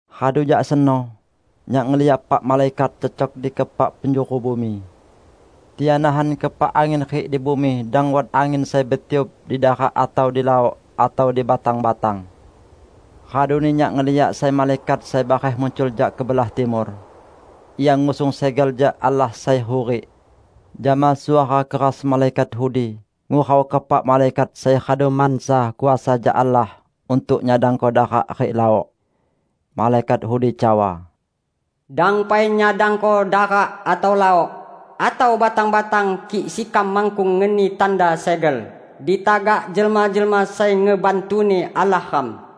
Radu jak seno, nyak ngeliak epak malaikat cecok di keepak penjuru bumi. Tian nahan keepak angin rik di bumi dang wat angin sai betiup di darak atau di laok, atau di batang-batang. Raduni nyak ngeliak sai malaikat sai bareh muncul jak kebelah timur. Ia ngusung segel jak Allah sai hurik. Jama suara keras malaikat udi ngurau keepak malaikat sai radu mansa kuasa jak Allah untuk nyadangko darak rik laok. Malaikat udi cawa, "Dang pai nyadangko darak atau laok, atau batang-batang kik sekam makkung ngeni tanda segel di tagak jelma-jelma sai ngebantu-Ni Allah ram."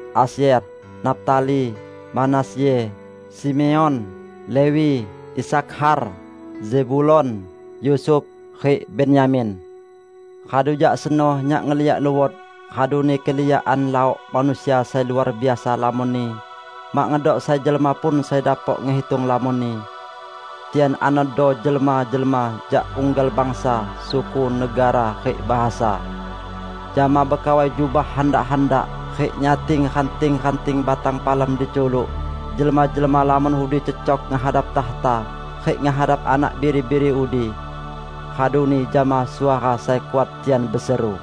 Asyer, Naftali, Manasye, Simeon, Lewi, Isakhar, Zebulon, Yusuf, rik Benyamin. Radu jak seno nyak ngeliak luot, raduni keliakan laok manusia sai luar biasa lamonni -- mak ngedok sai jelma pun sai dapok ngehitung lamonni. Tian anodo jelma-jelma jak unggal bangsa, suku, negara, rik bahasa. Jama bekawai jubah handak-handak rik nyating ranting-ranting batang palem di culuk, jelma-jelma lamon udi cecok ngehadap takhta rik ngehadap Anak Biri-biri udi. Raduni jama suara sai kuat tian beseru,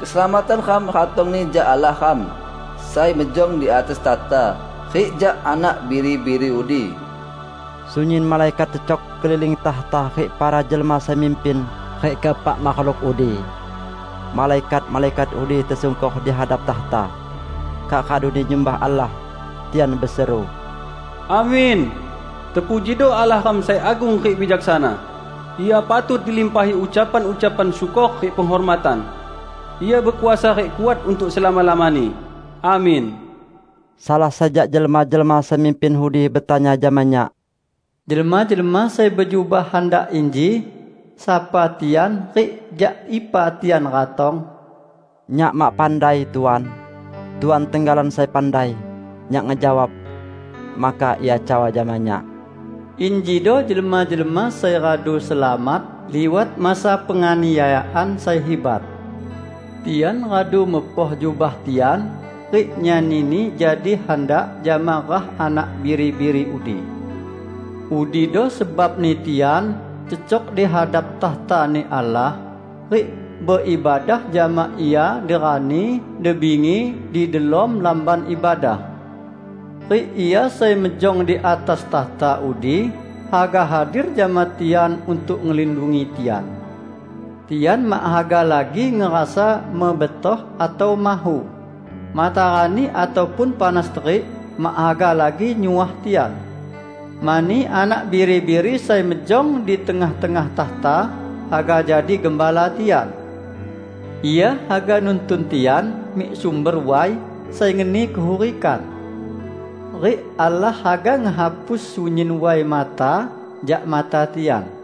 "Keselamatan ram ratongni jak Allah ram, sai mejong di atas takhta, rik jak Anak Biri-biri udi!" Sunyin malaikat cecok keliling takhta rik para jelma sai mimpin rik keepak makhluk udi. Malaikat-malaikat udi tesungkor dihadap takhta. Kak raduni nyumbah Allah. Tian beseru, "Amin! Terpujido Allah ram sai agung rik bijaksana. Ia patut dilimpahi ucapan-ucapan syukor rik penghormatan. Ia bekuasa rik kuat untuk selama-lamani! Amin." Salah sai jak jelma-jelma sai mimpin udi betanya jama nyak, "Jelma-jelma sai bejubah handak inji, sapa tian rik jak ipa tian ratong?" "Nyak mak pandai, Tuan. Tuan tenggalan sai pandai," nyak ngejawab. Maka ia cawa jama nyak, "Injido jelma-jelma sai radu selamat liwat masa penganiayaan sai hibat. Tian radu mepoh jubah tian rik nyanini jadi handak jama rah Anak Biri-biri udi. Udido sebabni tian cecok di hadap takhta-Ni Allah, rik beibadah jama Ia di rani di bingi di delom Lamban Ibadah. Rik Ia sai mejong di atas takhta udi haga hadir jama tian untuk ngelindungi tian. Tian mak haga lagi ngerasa mebetoh atau mahu; matarani ataupun panas terik mak haga lagi nyuah tian, mani Anak Biri-biri sai mejong di tengah-tengah takhta haga jadi gembala tian. Ia haga nuntun tian mik sumber way sai ngeni kehurikan. Rik Allah haga ngehapus sunyin way mata jak mata tian."